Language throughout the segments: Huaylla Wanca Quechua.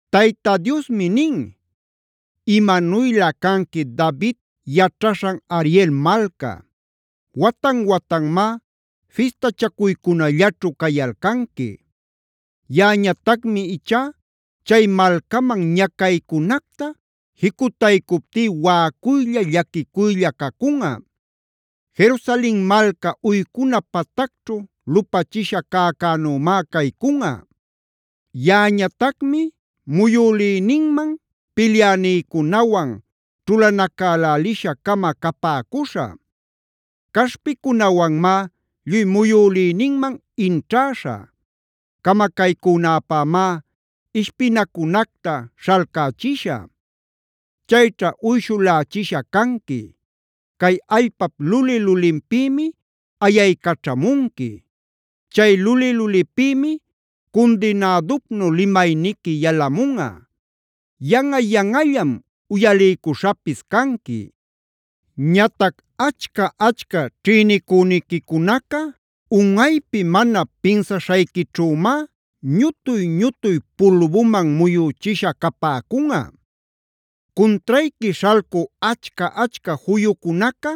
Tayta Diosmi nin: “¡Imanuylä canqui David yaćhaśhan Ariela malca! Watan-watanmá fistachacuycunallaćhu cayalcanqui. Yaꞌañatacmi ichá chay malcaman ñacaycunacta jicutaycuptí waꞌacuylla, llaquicuylla cacunꞌa. Jerusalen malca uycuna patacćhu lupachisha cäcänümáb caycunꞌa. Yaꞌañatacmi muyülïninman pilyänïcunawan ćhulanacälälisha-cama capäcuśhä; caśhpicunawanmá lluy muyülïninman inćhäśhä; camacaycünäpämá ishpinacunacta śhalcächishä. Chayćha uyshulächisha canqui. Cay allpap luli-lulinpïmi ayaycaćhamunqui; chay luli-lulipïmi cundinädupnu limayniqui yalamunꞌa; yanꞌa-yanꞌallam uyaliycuśhapis canqui. “Ñatac achca-achca ćhïnicüniquicunaca, unꞌaypi mana pinsaśhayquićhümá ñutuy-ñutuy pulbuman muyüchisha capäcunꞌa. Cuntrayqui śhalcü achca-achca juyucunaca,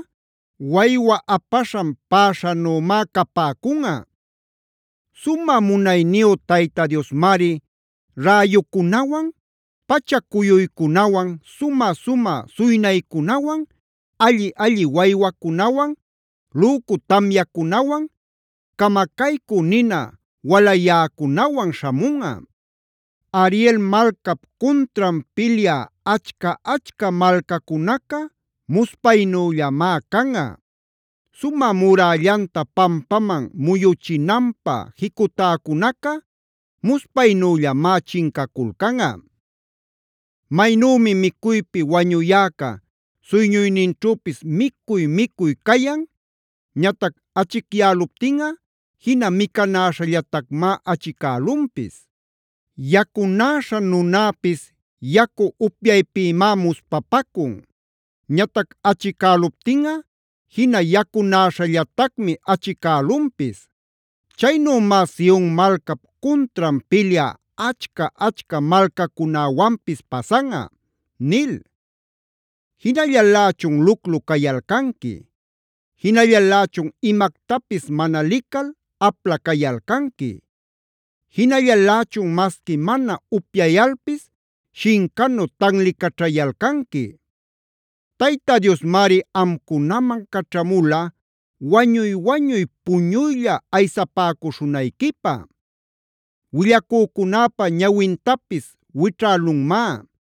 waywa apaśhan päśhanümá capäcunꞌa. Sumä munayniyu Tayta Diosmari räyucunawan, pacha-cuyuycunawan, sumä-sumä suynaycunawan, alli-alli waywacunawan, lücu tamyacunawan, camacaycü nina walayäcunawan śhamunꞌa. “Ariel malcap cuntran pilyä achca-achca malcacunaca muspaynüllamá canꞌa. Sumä murällanta pampaman muyuchinanpä jicutäcunaca muspaynüllamá chincaculcanꞌa. Maynümi micuypi wañuyäca suyñuyninćhüpis micuy-micuy cayan; ñatac achicyäluptinꞌa jina micanäśhallatacmá achicälunpis. Yacunäśha nunäpis yacu upyaypïmá muspapacun; ñatac achicäluptinꞌa jina yacunäśhallatacmi achicälunpis. Chaynümá Sion malcap cuntran pilyä achca-achca malcacunäwanpis pasanꞌa” nil. ¡Jinallalächun luclu cayalcanqui! ¡Jinallalächun imactapis mana lical apla cayalcanqui! ¡Jinallalächun masqui mana upyayalpis, shincanu tanlicaćhayalcanqui! Tayta Diosmari amcunaman caćhamula wañuy-wañuy puñuylla aysapäcuśhunayquipä. Willacücunäpa ñawintapis wićhälunmá;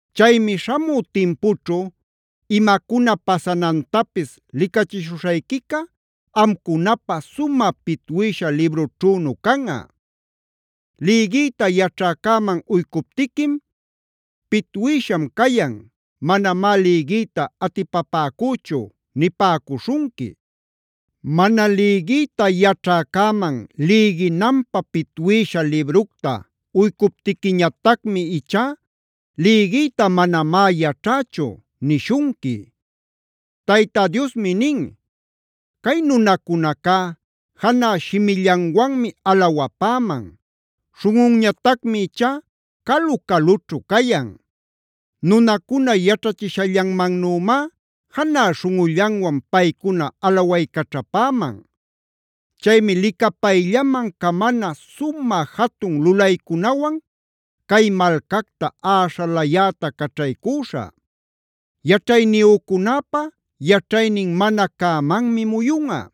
Chaymi śhamü timpućhu imacuna pasanantapis licachishuśhayquica amcunapä sumä pitwïsha librućhünu canꞌa. Lïgïta yaćhäcäman uycuptiquim: “Pitwïsham cayan, manamá lïgiyta atipapäcüchu” nipäcuśhunqui. Mana lïgiyta yaćhäcäman lïginanpä pitwïsha libructa uycuptiquiñatacmi ichá: “Lïgiyta manamá yaćhächu” nishunqui. Tayta Diosmi nin: “Cay nunacunacá janä shimillanwanmi alawapäman. Śhunꞌunñatacmi ichá calu-calućhu cayan.d Nunacuna yaćhachishallanmannümá janä śhunꞌullanwan paycuna alawaycaćhapäman. Chaymi licapayllaman camana sumä jatun lulaycunawan cay malcacta äśhalayäta caćhaycüśhä. Yaćhayniyücunäpa yaćhaynin mana cämanmi muyunꞌa;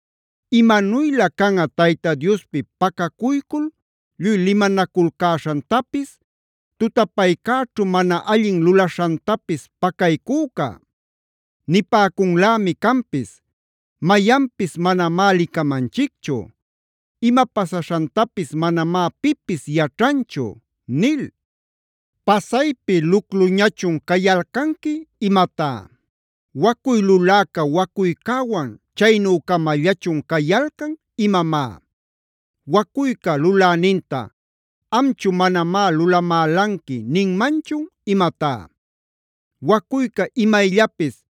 ¡Imanuylä canꞌa Tayta Diospi pacacuycul lluy limanaculcäśhantapis, tutapaycäćhu mana allin lulaśhantapis pacaycüca! Nipäcunlämi canpis: “Mayanpis manamá licamanchicchu. Ima pasaśhantapis manamá pipis yaćhanchu” nil. ¿Pasaypi lucluñachun cayalcanqui imatá? ¿Wacuy luläca wacuycäwan chaynü-camallachun cayalcan imamá? ¿Wacuyca luläninta: “Amchu manamá lulamälanqui” ninmanchun imatá? ¿Wacuyca imayllapis: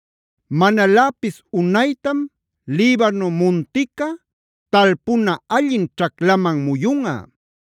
Manaläpis unaytam Libano muntica talpuna allin ćhaclaman muyunꞌa.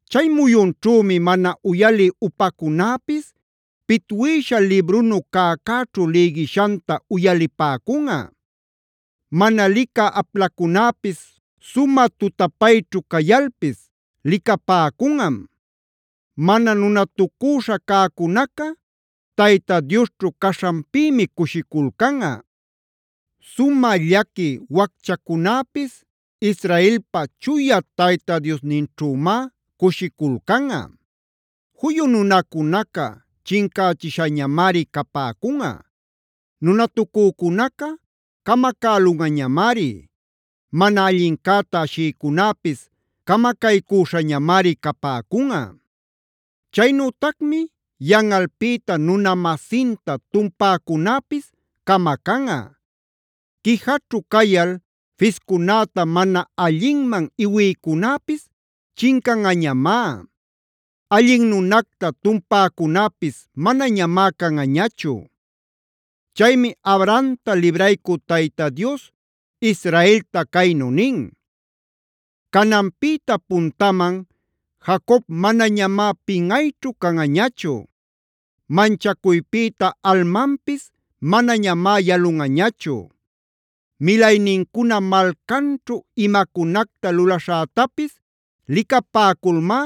Chay muyunćhümi mana uyalï upacunäpis pitwïsha librunu cäcäćhu lïgishanta uyalipäcunꞌa. Mana licä aplacunäpis sumä tutapayćhu cayalpis licapäcunꞌam. Mana nunatucüśha cäcunaca Tayta Diosćhu caśhanpïmi cushiculcanꞌa. Sumä llaqui wacchacunäpis Israelpa Chuya Tayta Diosninćhümá cushiculcanꞌa. Juyu nunacunaca chincächishañamari capäcunꞌa; nunatucücunaca camacälunꞌañamari; mana allincäta ashïcunäpis camacaycüśhañamari capäcunꞌa. Chaynütacmi yanꞌalpïta nuna-masinta tumpäcunäpis camacanꞌa. Quijaćhu cayal fiscunäta mana allinman iwïcunäpis chincanꞌañamá; allin nunacta tumpäcunäpis manañamá canꞌañachu. Chaymi Abrahamta libraycü Tayta Dios Israelta caynu nin: “Cananpïta puntaman Jacob manañamá pinꞌayćhu canꞌañachu. Manchacuypïta almanpis manañamá yalunꞌañachu. Milaynincuna malcanćhu imacunacta lulaśhätapis licapäculmá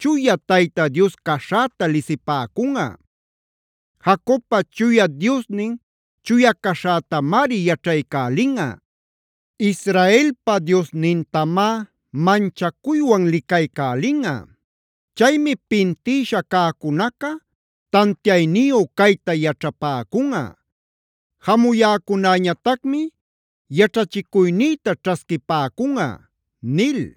Chuya Tayta Dios caśhäta lisipäcunꞌa. Jacobpa Chuya Diosnin chuya caśhätamari yaćhaycälinꞌa, Israelpa Diosnintamá manchacuywan licaycälinꞌa. Chaymi pintïsha cäcunaca tantiayniyu cayta yaćhapäcunꞌa; jamuyäcunäñatacmi yaćhachicuynïta ćhasquipäcunꞌa” nil.